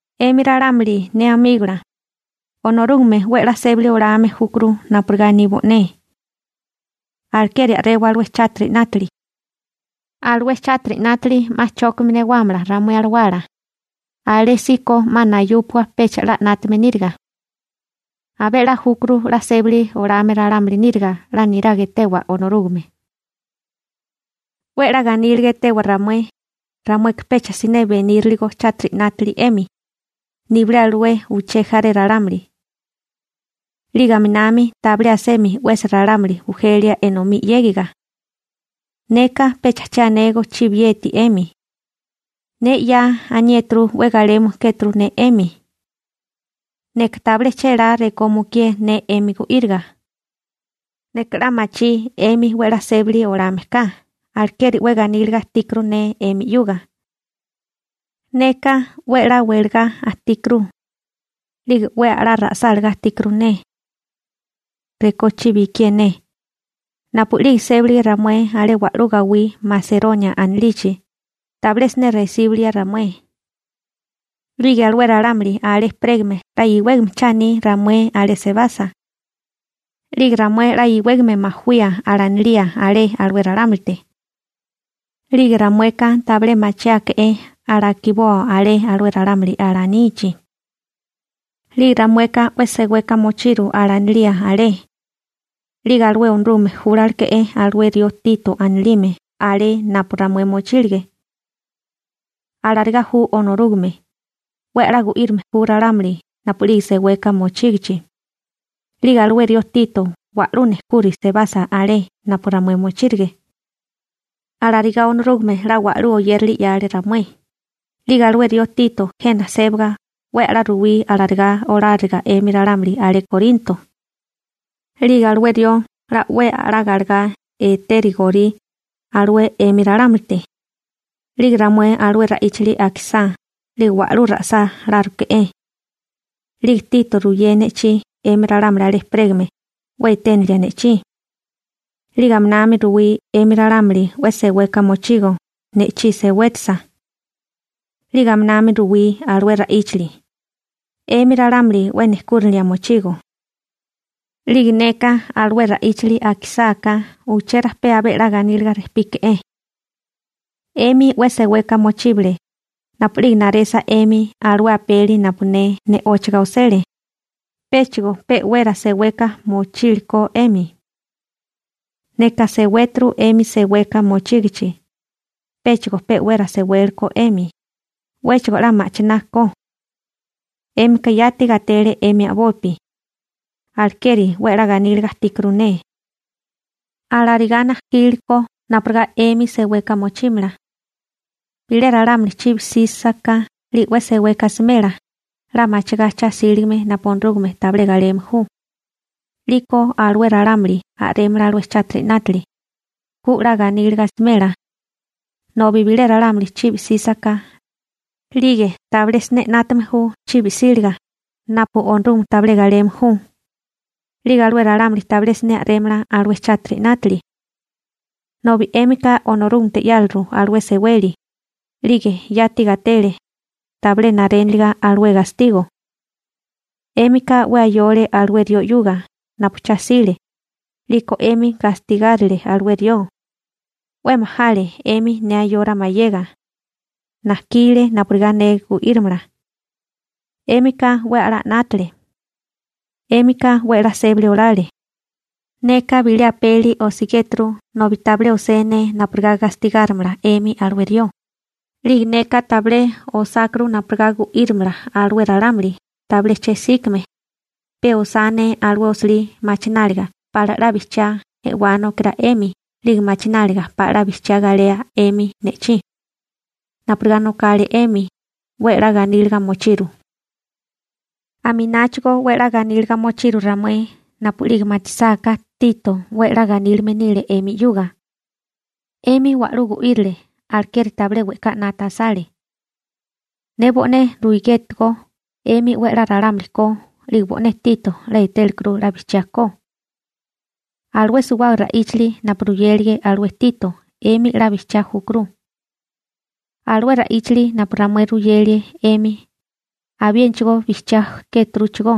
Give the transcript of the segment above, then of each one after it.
'Emi ralámuli ne amígola, Onorúgame 'we 'la sébali olame júkuru napurigá aní bo'né. Alekeri a'rewa alué chátiri 'nátili. Alué chátiri 'nátili 'ma chókame newámala ramué alawala, alésíko 'ma nayúpua pecha 'la 'nátame níriga. Abé 'la júkuru 'la sébali olame ralámuli níriga 'la niraga etewa Onorúgame. 'We 'la ganíliga etewa ramué, ramueka pecha siné beníriligo chátiri 'nátili 'emi, nibilé alué uché jaré ralámuli. 'Lige aminami tabilé asemi 'wesi ralámuli bujelia enomí 'yégiga. Neka pecha che anégó chibieti 'emi. Ne 'ya aniéturu 'we galeme kéturu ne 'emi. Neka tabilé chélá rekó mukié ne 'emi gu'íriga. Neka 'la machí 'emi 'we 'la sébali olame ka, alekeri 'we ganíliga ajtíkuru ne 'emi 'yuga. Neka 'we a'lá welagá ajtíkuru, 'lige 'we a'lá ra'sálagá ajtíkuru ne, rekó chibi ikié ne. Napu'lige sébalige ramué alé wa'lú gawí Maseronia anilichi, tabilé siné resíbulia ramué. 'Lige alué ralámuli alé ejperégame 'la iwégame cha aní ramué alé sebasa. 'Lige ramué 'la iwégame majawía alanilía alé alué ralámulite. 'Lige ramueka tabilé machiáeke'é alakiboa alé alué ralámuli alanichi. 'Lige ramueka 'we seweka mochiru alanilía alé. 'Lige alué Onorúgame júlaleke'é alué rió Tito anilime alé napu ramué mochílige. Alarigá ju Onorúgame, 'we a'lá gu'írame ju ralámuli napu'lige seweka mochígichi. 'Lige alué rió Tito wa'lú nejkuri sebasa alé napu ramué mochírige. Alarigá Onorúgame 'la wa'lú oyérali 'yale ramué. 'Lige alué rió Tito jena sébaga 'we a'lá ruwí alarigá oláriga 'emi ralámuli alé Korinto. 'Lige alué rió 'la 'we a'lá galegá etérigorí alué 'emi ralámulite. 'Lige ramué alué ra'íchali akisá 'lige wa'lú ra'sáláruke'é. 'Lige alué Tito ruyé ne'chí 'emi ralámuli alé ejperégame 'we eténilia ne'chí. 'Lige aminami ruwí 'emi ralámuli 'we seweka mochigo ne'chí sewétisa. 'Lige aminami ruwí alué ra'íchali, 'emi ralámuli 'we nejkúrinilia mochigo. 'Lige neka alué ra'íchili akisáká uché rajpé abé 'la ganíliga rejpíke'é. 'Emi 'we seweka mochíbale napu'lige naresa 'emi alué apeli napu ne ne'óchaga osele, péchigo pe'wera seweka mochíliko 'emi. Neka sewéturu 'emi seweka mochígichi, péchigo pe'wera sewélekó 'emi, 'wéchigo 'la ma'china ko. 'Émika yati gatele 'emi a'bopi, alekeri 'we 'la ganíliga ajtíkuru ne. Alarigá najkíliko napurigá 'emi seweka mochímala. Bilé ralámuli chibi 'sísaká 'lige 'we seweka asimela 'la machigá cha 'síligame napu Onorúgame tabilé galeme ju, 'liko alué ralámuli a'rémala alué chátiri 'nátili, ku 'la ganíliga asimela. Nobi bilé ralámuli chibi 'sísaká, 'lige tabilé siné 'nátame ju chibi 'síliga napu Onorúgame tabilé galeme ju, 'lige alué ralámuli tabilé siné a'rémala alué chátiri 'nátili. Nobi 'émika Onorúgamete 'yáliru alué seweli, 'lige yati gatele, tabilé naréniliga alué gastigo. 'Émika 'we ayole alué rió 'yuga napu cha 'sile, 'liko 'emi gastigárile alué rió. 'We majale 'emi ne ayora mayega. Najkile napurigá ne gu'írimala. 'Émika 'we a'lá 'nátale. 'Émika 'we 'la sébali olale. Neka bilé apeli osigéturu nobi tabilé osé ne napurigá gastigárimala 'emi alué rió, 'lige neka tabilé osákuru napurigá gu'írimala alué ralámuli tabilé che'síkime, pe osá ne alué osilí machináliga pala 'la bijchiá e'wánokirá 'emi 'lige machináliga pala 'la bijchiá galea 'emi ne'chí. Napurigá nokale 'emi, 'we 'la ganíliga mochiru. Amináchigo 'we 'la ganíliga mochiru ramué napu'lige machisáká Tito 'we 'la ganílime nile 'emi 'yuga. 'Emi wa'lú gu'írile, alekeri tabilé we'ká 'nata asale. Ne bo'né ruigétigó 'emi 'we a'lá ralámuli ko 'lige bo'né Tito 'la etélikuru 'la bijchiá ko. Alué suwábaga ra'íchali napu ruyélige alué Tito 'emi 'la bijchiá júkuru. Alué ra'íchali napu ramué ruyelie 'emi, abiénachigó bijchiá kéturuchigó.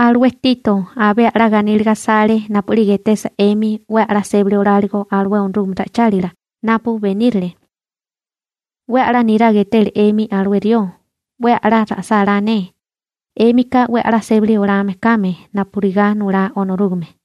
Alué Tito abé a'lá ganíliga asale napu'lige etesa 'emi 'we a'lá sébali oláligo alué Onorúgame ra'ichálila napu benírile. 'We 'la niraga e'tele 'emi alué rió. 'We a'lá ra'sálá ne, 'émika 'we a'lá sébali olame kame napurigá nulá Onorúgame.